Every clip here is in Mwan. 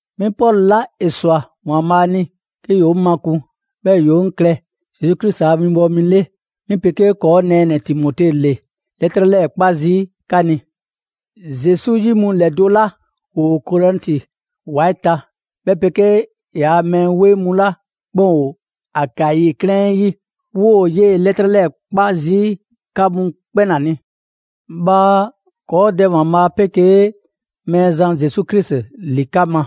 'Mi Pɔlu 'la ‑e ꞊swa ‑Waanbhaa' ni 'ke ‑yoo 'ŋ makun, 'bhɛɛ‑ ‑yoo 'ŋ klɛ Zesu Krisi a winbɔwo mi 'le; 'mi 'pegee ‑kɔɔ' nɛɛnɛ‑ Timote ‑le 'lɛtrɛ 'lɛɛ‑ 'kpa zii' 'ka ni. Zesu 'yi mu ‑lɛdo' 'la ‑woo Korɛnti ‑wa 'ɛ ta, 'bhɛ 'pegee ‑yaa' mɛɛ 'weŋ mu 'la 'kpɛn ‑o Akayi 'klɛɛn 'ɛ 'yi, 'woo‑ 'yee‑ 'lɛtrɛ 'lɛɛ‑ 'kpa zii' 'mu ‑la 'kpɛn ni. Bhaa ‑kɔɔ' Dɛ ‑Waanbhaa' 'pegee Mɛɛzan Zesu Krisi ‑li 'ka ma,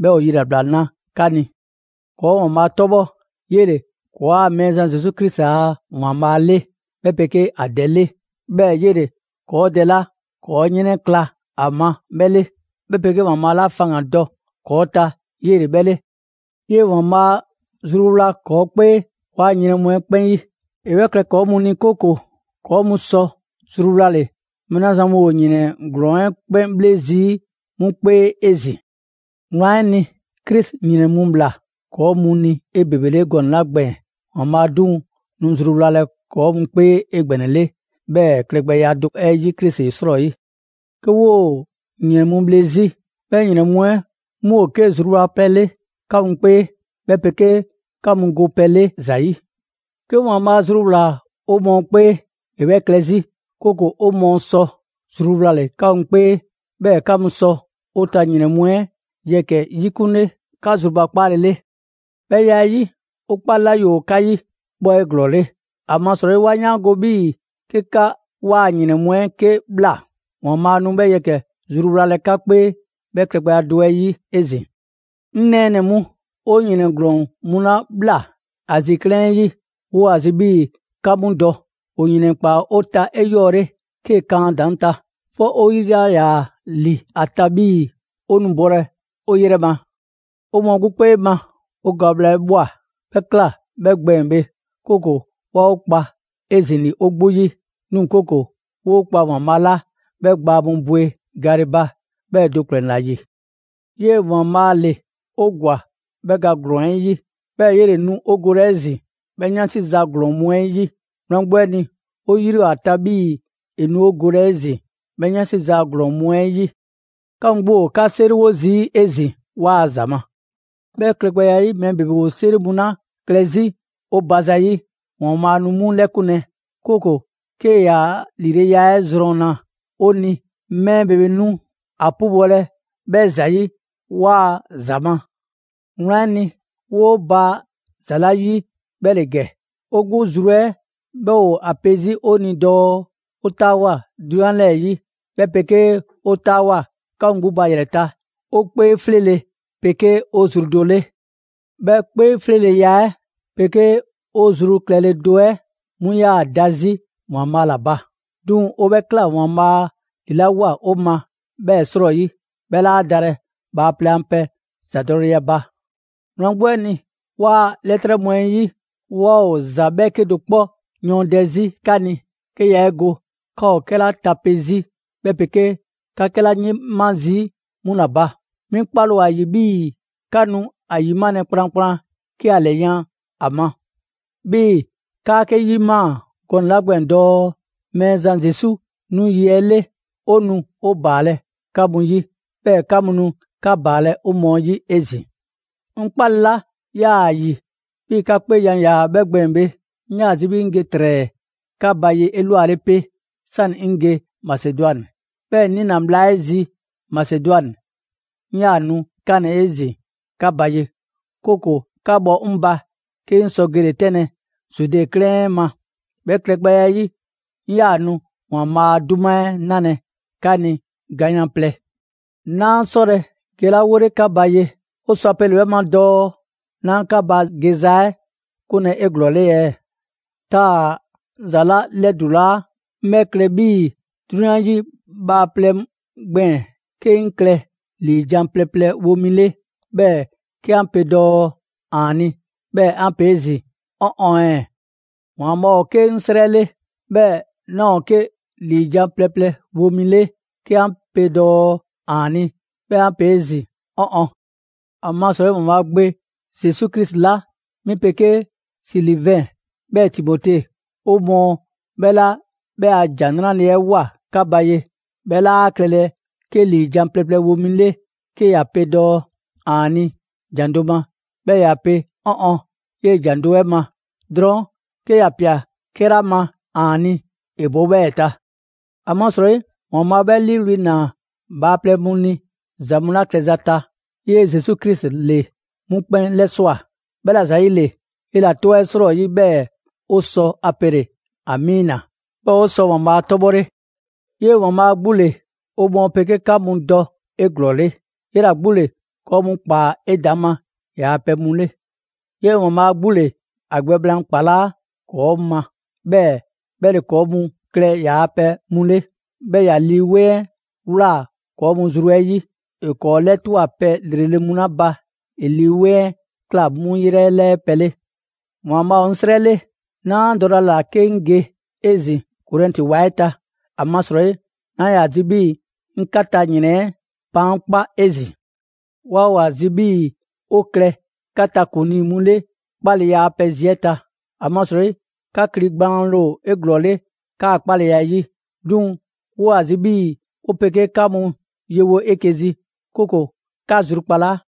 'bhɛɛ‑ ‑o yilabla na 'ka ni. ‑Kɔɔ' ‑Waanbhaa' 'tɔbhɔ, 'yele‑ ‑kɔɔa' Mɛɛzan Zesu Krisi a ‑Waanbhaa' 'le 'bhɛ 'pegee ‑a Dɛ 'le. 'Bhɛɛ‑ 'yele‑ ‑kɔɔ' Dɛ 'la ‑kɔɔ' 'yrɛnkla‑ a ma 'bhɛ 'le, 'bhɛ 'pegee‑ Waanbhaa' 'la faŋgandɔ ‑kɔɔ ta 'yele‑ 'bhɛ 'le. 'Yee‑ ‑Waanbhaa' zruwla ‑kɔɔ' 'kpee ‑kɔɔa' ‑yrɛn mu 'ɛ 'kpɛn 'yi. ‑E 'bhɛ klɛ ‑kɔɔ' mu ni, 'kooko‑ ‑kɔɔ' mu sɔ zruwlale mɛɛ 'la zan mu ‑o ‑yrɛn ‑glɔɔn 'ɛ 'kpɛn 'bhle zii' 'mu 'kpee 'ezin‑. Wlan 'ɛ ni, Krisi ‑yrɛn mu꞊bhla ‑kɔɔ' mu ni 'ebebele gɔnɛ‑ 'la gbɛɛn‑, ‑Waanbhaa' 'duŋ‑ nu zruwlalɛ ‑kɔɔ' mu 'kpee 'egbɛnɛle 'bhɛɛ‑ klɛgbɛya do 'ɛ 'yi Krisi 'srɔyi. 'Ke 'woo‑ ‑yrɛn mu bhle 'zi, 'bhɛ ‑yrɛn mu 'ɛ 'mu ‑o 'ke zruwlapɛ 'le 'ka mu 'kpee, 'bhɛ 'pegee 'ka mu go pɛ 'le ‑za 'yi. 'Ke ‑Waanbhaa' zruwlaa‑ 'o mɔɔ 'kpee, ‑e 'bhɛ klɛ 'zi, 'kooko‑ 'o mɔɔ sɔ zruwlale 'ka mu 'kpee, 'bhɛɛ‑ 'ka mu sɔ 'o ta ‑yrɛn mu 'ɛ yɛkɛ‑ 'yikunle 'ka zrubakpaale 'le. 'Bhɛ ya 'ɛ 'yi, 'o 'kpale‑ 'la ‑yoo 'ka 'yi, 'bhɛ ‑o 'eglɔɔle. ‑Amasrɔyi 'wa 'yaango‑ 'bhii‑ 'ke 'ka 'waa‑ ‑yrɛn mu 'ɛ 'ke ꞊bhla, ‑Waanbhaa' nu 'bhɛ yɛkɛ‑ zruwlalɛ 'ka 'kpee 'bhɛ klɛgbɛya do 'ɛ 'yi 'ezin‑. 'Ŋ nɛɛnɛ‑ mu, ‑o ‑yrɛn ‑glɔɔn mu 'la ꞊bhla Azi 'klɛɛn 'ɛ 'yi, 'woo‑ ‑a zi 'bhii‑ 'ka 'mu dɔ: ‑o ‑yrɛn ‑kpaa 'o ta 'eyɔɔle 'kee‑ kan ‑a ‑daŋ' ta, 'fɔ 'o 'yri 'laa ‑yaa ‑li ‑a ta 'bhii‑ 'o nu bolɛ 'o 'yrɛ ma. 'O mɔɔ 'gbu 'kpee ma 'o ga bhla 'ɛ ꞊bhwa. 'Bhɛ 'kla‑ 'bhɛ gbɛɛn‑ bhe, 'kooko‑ 'waa 'o kpa 'ezin‑ ‑li 'o 'gbu 'yi, 'duŋ‑ 'kooko‑ 'woo 'kpa ‑Waanbhaa' 'la 'bhɛ gbaa mu bwe gale ba 'bhɛ do ‑kplɛn ‑la ‑yi. 'Yee‑ ‑Waanbhaa' ‑le 'o ‑gwa 'bhɛ ga ‑glɔɔn 'ɛ 'yi; 'bhɛɛ‑ 'yele‑ nu 'o golɛ 'ezin‑ 'bhɛ 'yansi ‑za ‑glɔɔn mu 'ɛ 'yi. Wlan 'gbu 'ɛ ni, 'o 'yri ‑o ‑a ta 'bhii‑ ‑e nu 'o golɛ 'ezin‑ 'bhɛ 'yansi ‑za ‑glɔɔn mu 'ɛ 'yi. 'Ka mu 'gbu ‑o 'ka 'seriwo zii' 'ezin‑ 'waa‑ ‑za ma. 'Bhɛ klɛgbɛya 'ɛ 'yi, mɛɛ ‑bebe ‑o 'seri mu 'la klɛ 'zi 'o ba zayi', ‑Waanbhaa' nu 'mu 'lɛkunlɛ, 'kooko‑ 'kee‑ ‑yaa' ‑lileya 'ɛ ‑zrɔnna 'o ni, mɛɛ ‑bebe mu nu a 'pubɔlɛ 'bhɛ ‑zayi' 'waa‑ ‑za ma. Wlan 'ɛ ni, 'woo baa ‑za 'la 'yi 'bhɛ ‑le ‑gɛ: 'o 'gbu zru 'ɛ 'bhɛ ‑o ‑a pe 'zi 'o ni dɔɔ 'o 'taawoa꞊ 'drunyan 'lɛɛ‑ 'yi, 'bhɛ 'pegee 'o 'taawoa꞊ 'ka mu 'gbu ba ‑yrɛ ta, 'o 'kpee 'fleele‑ 'pegee 'o zru do 'le; 'bhɛ 'kpee 'fleeleya 'ɛ 'pegee 'o zru klɛle do 'ɛ 'mu 'yaa‑ da 'zi ‑Waanbhaa' ‑la ba. 'Duŋ‑ 'o 'bhɛ ꞊kla ‑Waanbhaa' ‑lilawoa 'o ma 'bhɛɛ‑ 'srɔyi, 'bhɛ 'laa dalɛ bhaaplɛŋ a pɛ ‑zadɔleya ba. Wlan 'gbu 'ɛ ni, 'waa‑ 'lɛtrɛ mu 'ɛ 'yi, 'waa ‑o ‑za 'bhɛɛke do 'kpɔ yɔɔndɛ 'zi 'ka ni, 'ke yaa 'e go 'ka ‑o 'kɛla tape 'zi, 'bhɛ 'pegee 'ka 'kɛla 'yima zii' 'mu ‑la ba. 'Bhɛɛ‑ 'mi 'kpale‑ ‑o ‑a ‑yi 'bhii‑ 'ka nu ‑a ‑yimalɛ kplankplan 'ke ‑a ‑lɛyan' ‑a ma. 'Bhii‑ 'kaa 'ke 'yimaa‑ gɔnɛ‑ 'la gbɛɛn‑ dɔɔ: Mɛɛzan Zesu 'nu yi 'ɛ 'le, 'o nu 'o ‑baalɛ' 'ka mu 'yi, 'bhɛɛ‑ 'ka mu nu 'ka ‑baalɛ' 'o mɔɔ 'yi 'ezin‑. 'Ŋ 'kpale 'la 'yaa‑ ‑a ‑yi 'bhii‑ 'ka 'kpeejan‑ ‑yaa 'bhɛ gbɛɛn‑ bhe, 'ŋ 'yaa‑ zi 'bhii‑ 'ŋ ge ‑trɛɛ 'ka ba ye 'elwale 'pe, 'sani‑ 'ŋ ge Masedwani, 'bhɛɛ‑ 'ŋ 'niina‑ bhla 'ɛ zi Masedwani, 'ŋ 'yaa‑ nu 'kanlɛ‑ 'ezin‑ 'ka ba ye, 'kooko‑ 'ka bhɔ 'ŋ ba 'ke 'ŋ sɔ gele‑ 'tɛnlɛ‑ Zude 'klɛɛn 'ɛ ma. 'Bhɛ klɛgbɛya 'ɛ 'yi, 'ŋ 'yaa‑ nu ‑Waanbhaa' a 'duma 'ɛ 'nalɛ‑ 'ka ni ganyan‑ plɛ. 'Naa 'sɔlɛ‑ gelawole 'ka ba ye, ‑o sɔ ‑a pele‑ 'bhɛ ma dɔɔ 'naa 'ka ba geza 'ɛ 'kunlɛ‑ 'eglɔɔle ɛɛ? Taa‑ 'ŋ ‑za 'la 'lɛdulaa, 'ŋ 'bhɛ klɛ 'bhii‑ 'drunyan 'yi bhaaplɛŋ gbɛɛn‑ 'ke 'ŋ klɛ ‑liijan' plɛ wo mi 'le, 'bhɛɛ‑ 'ke 'an pe dɔɔ: «‑Aani'», 'bhɛɛ‑ 'an pe 'ezin‑ «'Ɔn ɔn ɛɛ?» ‑Waanbhaa' ‑o 'ke 'ŋ 'srɛ 'le, 'bhɛɛ‑ 'naa ‑o 'ke ‑liijan' plɛ mi wo mi 'le 'ke 'an pe dɔɔ: «‑Aani'». 'Bhɛɛ‑ 'an pe 'ezin‑ «'Ɔn ɔn». ‑Amasrɔyi ‑Waanbhaa' Gbe Zesu Krisi 'la 'mi 'pegee Silivɛn 'bhɛɛ‑ Timote, 'o mɔɔ 'bhɛ 'la 'bhɛ a ‑Jan 'Nrale‑ 'ɛ ꞊woa 'ka ba ye, 'bhɛ 'laa klɛlɛ 'ke ‑liijan' plɛ mi wo mi 'le 'ke ‑ya pe «‑Aani'» ‑jan do ma, 'bhɛɛ‑ ‑ya pe «'Ɔn ɔn» 'yee‑ ‑jan do 'ɛ ma. Drɔɔn' 'ke ‑ya ꞊pia 'kɛla ma «‑Aani'», ‑e bo 'bhɛɛ‑ ta. ‑Amasrɔyi ‑Waanbhaa' 'bhɛ 'liiwli‑ ‑naa bhaaplɛŋ mu ni ‑za mu 'la klɛza ta, 'yee‑ Zesu Krisi ‑le 'mu 'kpɛn 'lɛswa꞊. 'Bhɛla‑ ‑zayile, 'yela‑ 'tɔ 'ɛ 'srɔyi 'bhɛɛ‑ 'o sɔ ‑a pele‑ «Amiina». 'Bhɛɛ‑ 'o sɔ ‑Waanbhaa' 'tɔbhɔle. 'Yee‑ ‑Waanbhaa' 'gbu ‑le 'o mɔɔ 'pegee 'ka mu dɔ 'eglɔɔle. 'Yela‑ 'gbu ‑le ‑kɔɔ' mu ‑kpaa 'edaŋma ‑yaa' pɛ mu 'le. 'Yee‑ ‑Waanbhaa' 'gbu ‑le ‑a gbɛ blaan ‑kpalaa' ‑kɔɔ' ma, 'bhɛɛ‑ 'bhɛ ‑le ‑kɔɔ' mu klɛ ‑yaa' pɛ mu 'le. 'Bhɛɛ‑ ‑ya Lii 'Weŋ 'ɛ ꞊wlaa ‑kɔɔ' zru mu 'ɛ 'yi. ‑E ‑kɔɔ' 'lɛtwa꞊ pɛ ‑lrele' mu 'la ba, ‑e Lii 'Weŋ 'ɛ ꞊kla 'mu 'yrɛ 'lɛɛ pɛ 'le. ‑Waanbhaa' ‑o 'ŋ 'srɛ 'le, 'naa dɔlɛ ‑a ‑la 'ke 'ŋ ge 'ezin‑ Korɛnti ‑wa 'ɛ ta, ‑amasrɔyi 'naa ‑yaa zi 'bhii‑ 'ŋ 'ka ta ‑yrɛn 'ɛ baankpa' 'ezin‑. 'Waa ‑o ‑a zi 'bhii‑ 'o klɛ 'ka ta ‑kuŋlii mu 'le 'kpaleya a pɛ zi 'ɛ ta. ‑Amasrɔyi 'ka kli gbaanle ‑o 'eglɔɔle 'kaa‑ 'kpaleya 'ɛ 'yi. 'Duŋ‑ 'woo‑ ‑a zi 'bhii‑ 'o 'pegee 'ka mu yewo 'eke‑ zi, 'kooko‑ 'ka zrukpalaa.